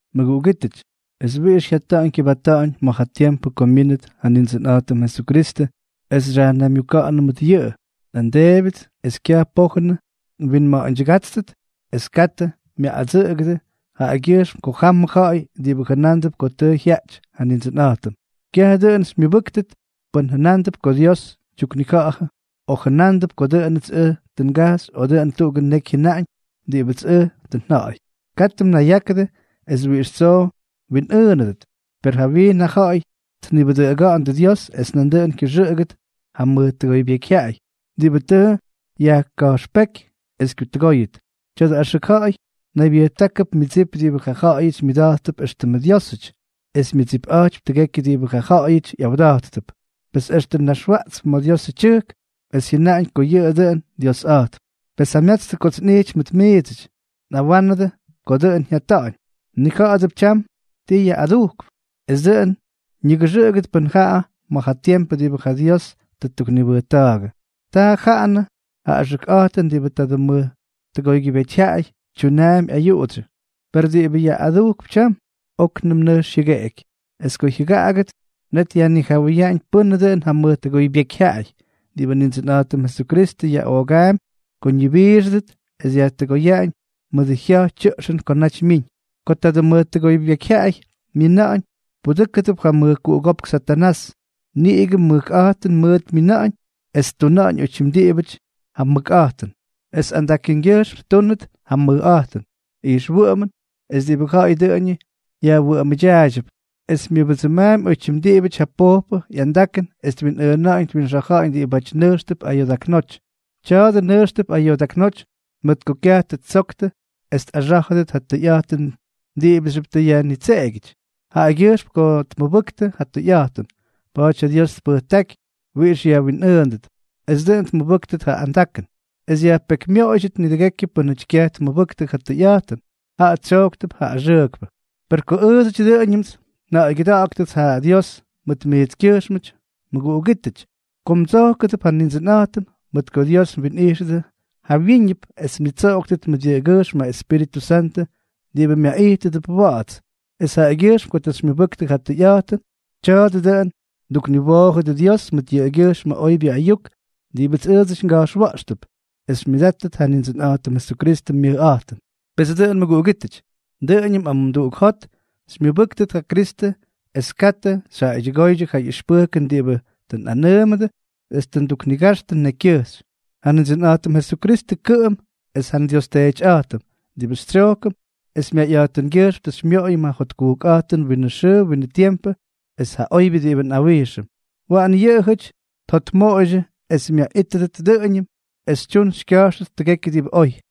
Mʉguꞌugítʉty, es wiꞌix jyata̱ꞌa̱ñ kyʉbata̱ꞌa̱ñ ma̱ ja tiempʉ ko myínʉt ja Nindsʉnꞌa̱jtʉm Jesukristʉ es xyajnaymyuka̱ꞌa̱nʉm mʉt yʉꞌʉ, nꞌandeebyʉts es kyaj pojʉn mwinma̱a̱ydyʉgátstʉt es katʉ myaꞌꞌadsʉꞌʉgʉdʉ jaꞌagyʉjxm ko jamʉ ja̱ꞌa̱y diꞌibʉ jʉnándʉp ko tʉ jyaꞌty ja Nindsʉnꞌa̱jtʉm. Kyaj dʉꞌʉn xymyʉbʉ́ktʉt pʉn jyʉna̱ꞌa̱ndʉ ko Dios tyuknija̱ꞌa̱jʉ, o jʉnándʉp ko dʉꞌʉnʉts ʉj tʉ ngajxy o dʉꞌʉn tuꞌugʉ neky jyʉnaꞌañ diꞌibʉtsk ʉj tʉ nja̱ꞌa̱y. Katʉ mnayyákʉdʉ es wiꞌix tsoo mwinꞌʉʉnʉdʉt. Pes jawyiin ja ja̱ꞌa̱y tnibʉdʉꞌʉga̱ꞌa̱ndʉ Dios es nandʉꞌʉn kyʉxʉꞌʉgʉt ja mʉj tʉgoybyekyjyaꞌay diꞌibʉ tʉ yajka̱jxpéky es kyutʉgóyʉt. Tya̱dʉ axʉk ja̱ꞌa̱y naybyʉjtákʉp myʉdsip diꞌibʉ ja jaꞌayʉty myʉda̱jttʉp éxtʉmʉ dyiósʉty, es myʉdsipꞌa̱jtypy tʉgekyʉ diꞌibʉ ja ja̱ꞌa̱yʉty ꞌyawda̱jttʉp. Pes extʉ naxwaꞌtsp ma̱ Diosʉ tyʉjk, es jyʉnaꞌañ ko yʉꞌʉ dʉꞌʉn Diosꞌa̱jtp. Pes jamyatstʉ kots nꞌijty mʉt miidsʉty, nꞌawa̱ꞌa̱nʉdʉ ko dʉꞌʉn jyata̱ꞌa̱ñ. Mnija̱ꞌa̱dʉp tyam ti yaꞌꞌadujkʉp, es dʉꞌʉn ñigʉxʉꞌʉgʉt pʉ́n jaꞌa ma̱ ja tiempʉ diꞌibʉ ja Dios tʉ ttuknibʉjta̱a̱gʉ. Taa jaꞌanʉ ja axʉkꞌa̱jtʉn diꞌibʉ tadʉ mʉj tʉgoybyekyjyaꞌay tyunaampy ayuꞌudsyʉ. Per diꞌibʉ yaꞌꞌadujkʉp tyam, óknʉm nʉjx jyʉgeꞌeky. Es ko jyʉgaꞌagʉt, net yajnijawʉyaꞌañ pʉ́nʉ dʉꞌʉn ja mʉj tʉgoybyekyjyaꞌay, diꞌibʉ Nindsʉnꞌa̱jtʉm Jesukristʉ yaꞌoogaampy ko ñibiixʉdʉt es dyajtʉgoyaꞌañ mʉdʉ jya̱j tyʉꞌxʉn ko naty myiñ. Ko tadʉ mʉj tʉgoybyekyjyaꞌay myina̱ꞌa̱ñ, pudʉ́kʉdʉp ja mʉjkuꞌugópk Satanás. Niꞌigʉ mʉkꞌa̱jtʉn mʉʉt myina̱ꞌa̱ñ es ttuna̱ꞌa̱ñ oytyim diꞌibʉty ja mʉkꞌa̱jtʉn, es andakʉngyʉjxm ttúnʉt ja mʉjꞌa̱jtʉn, ijxwʉꞌʉmʉn es diꞌibʉ ja̱ꞌa̱y dʉꞌʉñʉ yajwʉꞌʉmʉdyaaydyʉp. Es myʉbʉdsʉmaampy oytyim diꞌibʉty ja pojpʉ ꞌyandakʉn es twinꞌʉʉna̱ꞌa̱ñ twinxa̱ja̱ꞌa̱ñ diꞌibáty nʉjxtʉp ayoodaknóty. Tya̱a̱dʉ nʉjxtʉp ayoodaknóty mʉt ko kyaj tʉ ttsoktʉ es tꞌaxá̱jʉdʉt ja tʉyꞌa̱jtʉn diꞌibʉxyʉp tʉ yajnitseꞌegyʉty. Jaꞌagyʉjxm ko tkamʉbʉktʉ ja tʉyꞌa̱jtʉn, pa̱a̱ty ja Dios tpʉjtáky wiꞌix yajwinꞌʉʉndʉt, es dʉꞌʉn tmʉbʉ́ktʉt ja andakʉn, es yajpekymyoꞌoydyʉt nidʉgekyʉ pʉ́nʉty kyaj tmʉbʉktʉ ja tʉyꞌa̱jtʉn, jaꞌa tsyojktʉp ja axʉʉkpʉ. Per oy ko ʉʉdsʉty dʉꞌʉñʉmts nja̱ꞌa̱ygyʉda̱ꞌa̱ktʉts ja Dios mʉt miitskyʉjxmʉty, mʉguꞌugítʉty, ko mdsojkʉdʉp ja Nindsʉnꞌa̱jtʉm, mʉt ko Dios mwinꞌijxʉdʉ jawyíñʉp es mnitsoꞌoktʉt mʉt yʉꞌʉgyʉjxm ja Espíritʉ Santʉ diꞌibʉ myaꞌijtʉdʉp wa̱ꞌa̱ts, es jaꞌagyʉjxm ko tʉ xymyʉbʉktʉ ja tʉyꞌa̱jtʉn. Tya̱a̱dʉ dʉꞌʉn mdukniwoojʉdʉ Dios mʉt yʉꞌʉgyʉjxmʉ oybyʉ ayuk diꞌibʉts ʉʉdsʉty nga̱jxwa̱ꞌxtʉp, es xymyʉdáttʉt ja Nindsʉnꞌa̱jtʉm Jesukristʉ myʉjꞌa̱jtʉn. Pes dʉꞌʉn mʉguꞌugítʉty, dʉꞌʉñʉm amumduꞌuk jot xymyʉbʉ́ktʉt ja Kristʉ es katʉ xyjaꞌaydyʉgóydyʉ ja ʉxpʉjkʉn diꞌibʉ tʉ nꞌanʉʉmʉdʉ es tʉ nduknigaxtʉ nekykyʉjxy. Ja Nindsʉnꞌa̱jtʉm Jesukristʉ kʉꞌʉm, es ja nDios Teetyꞌa̱jtʉm, diꞌibʉ xytsyojkʉm es myayꞌa̱jtʉngyʉjxm tʉ xymyoꞌoyʉm ja jotkujkꞌa̱jtʉn winʉ xʉʉ winʉ tiempʉ es ja oybyʉ diꞌibʉ nꞌawijxʉm, waꞌan yʉꞌʉjʉty mjotmʉkmoꞌoyʉdʉ es myaꞌítʉdʉt dʉꞌʉñʉm es xytyun xykya̱jxtʉt tʉgekyʉ diꞌibʉ oy.